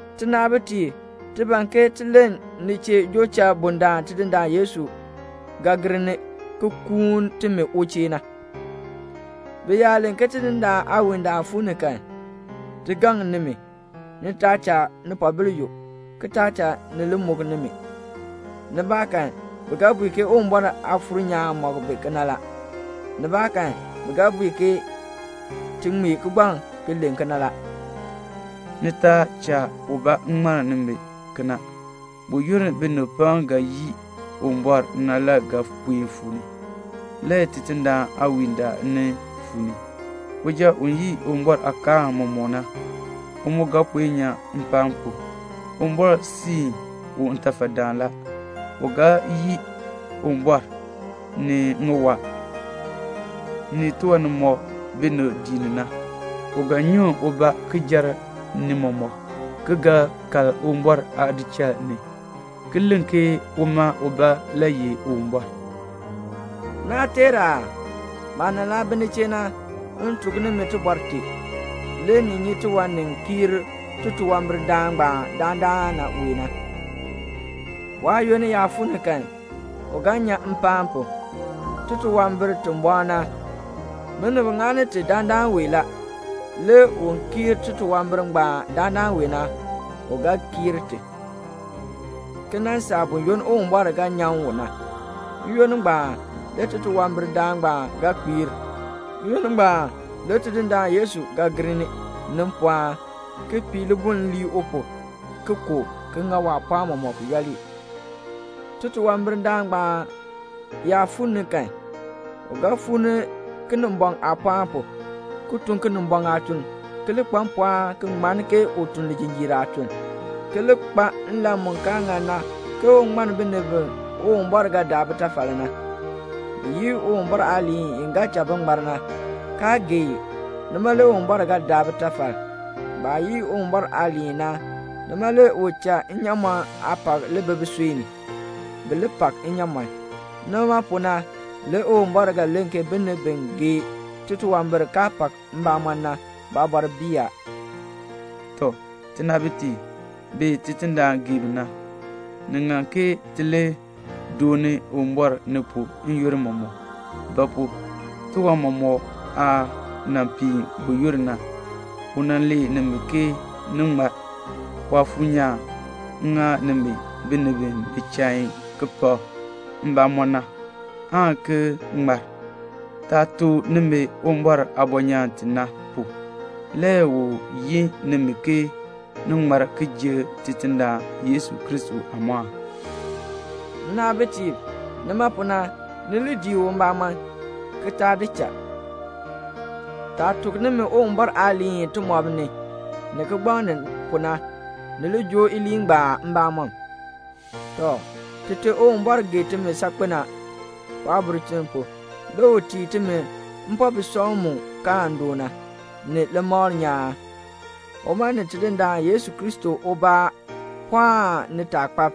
Tinaabitiib, ti ban ke ti len ni chee joo cha bundaln Tidindaan Yesu Kristo ga gir ni ki kuun timi u chee na. Bi yaa len ke Tidindaan aawiindaal fuu ni kan, ti gaŋ nimi, ni taa cha nipoobil yuk, ki taa cha ni li muk nimi. Nibaakan bi ga bui ke Uwumbɔr Aafuur nyaan mɔk bi kena la, nibaakan bi ga bui ke ti ŋmee kigbaŋ ki len kena la. Ni taa cha ubaa ŋmann nimi kena; buyoonn binib pam ga yii Uwumbɔr na le ga puen fuu ni, le Tidindaan aawiindaal nin fuu ni. Uja u yii Uwumbɔr aakaal mɔmɔk na, u mu ga puen kpiir. Uwumbɔr siin u ntafadaan la. U ga yii Uwumbɔr, ni ŋiwaa, ni tiwan nimɔk binib dii ni na. U ga nyuŋ ubaa ki jer ni mɔmɔk, ki ga kal Uwumbɔr aadichal ni, ki len ke uma ubaa le ye Uwumbɔr. Naa teer aa? Maah nan laa bi ni chee na, m tuk nimi tibɔr tee. Le ni nyi tiwan ni kiir titunwambirdaan ngbaan dandana wee na. Waayoonn yaa fuu ni kan, u ga kpiir. Titunwambir ti bɔɔ na, binib ŋani ti dandana wee la. Le un kiir titunwambir ngbaan dandana wee na, u ga kiir ti, ki nan saa buyoonn Uwumbɔr ga nyan u na. N-yoonn ngbaan le titunwambirdaan ngbaan ga kpiir. N-yoonn ngbaan le Tidindaan Yesu ga gir ni, ni mpɔɔn, ki pii libuln lii u pu, ki ku u, ki ŋa waapɔɔn mɔmɔk yooli. Titunwambirdaan ngbaan yaa fuu ni kan, u ga fuu ni Kinimbɔŋ aapɔɔn pu, ki tun Kinimbɔŋ aatuln, ki li kpa mpɔɔn ki ŋmann ke u tun lijinjiir aatun, ki li kpa nlan mu kaa ŋan na ke un ŋmann binib bi Uwumbɔr ga daa bitafal na. Bi yii Uwumbɔr aaliin i ga cha bi ŋmar na, kaa gee i. Nima le Uwumbɔr ga daa bitafal. Baah yii Uwumbɔr aaliin na, nima le u cha nnyaamɔn aapak li bi bisui ni, bi li pak nnyaamɔn. Nima pu na le Uwumbɔr ga len ke binib bi gee titunwambir kaa pak mbamɔn na, baabɔr bii a. Tɔ, tinaabitiib bi Tidindaan gee bi na, ni ŋan ke ti li dooni Uwumbɔr ni pu n-yoonn mɔmɔk; ba pu? tiwan mɔmɔk aah nan piin buyoonn na, u nan lee nimi ke ni ŋmar. Waafuur nyaan ŋa nimi binib bi bi chain ki pak mbamɔn na, aan ki ŋmar. Taah tuk nimi Uwumbɔr aabɔnyaan ti na pu, le u yin nimi ke ni ŋmar ki ji Tidindaan Yesu Kristo aamɔɔn. Nnaabitiib, nima pu na, ni li dii u mbamɔm, ki taa di cha. Taah tuk nimi Uwumbɔr aaliin timɔb ni, ni kigbaŋ ni pu na, ni li joo iliin ngbaan mbamɔm. Tɔ, Tite Uwumbɔr gee timi saakpen a. Waabulchin pu, le u tii timi mpobisɔŋ mu kaan doo na, ni limakl nyaan. Uma ni Tidindaan Yesu Kristo ubaa pɔɔn nitaakpab,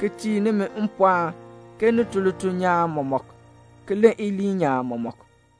ki tii nimi mpɔɔn ke ni tun lituln nyaan mɔmɔk, ki len iliin nyaan mɔmɔk.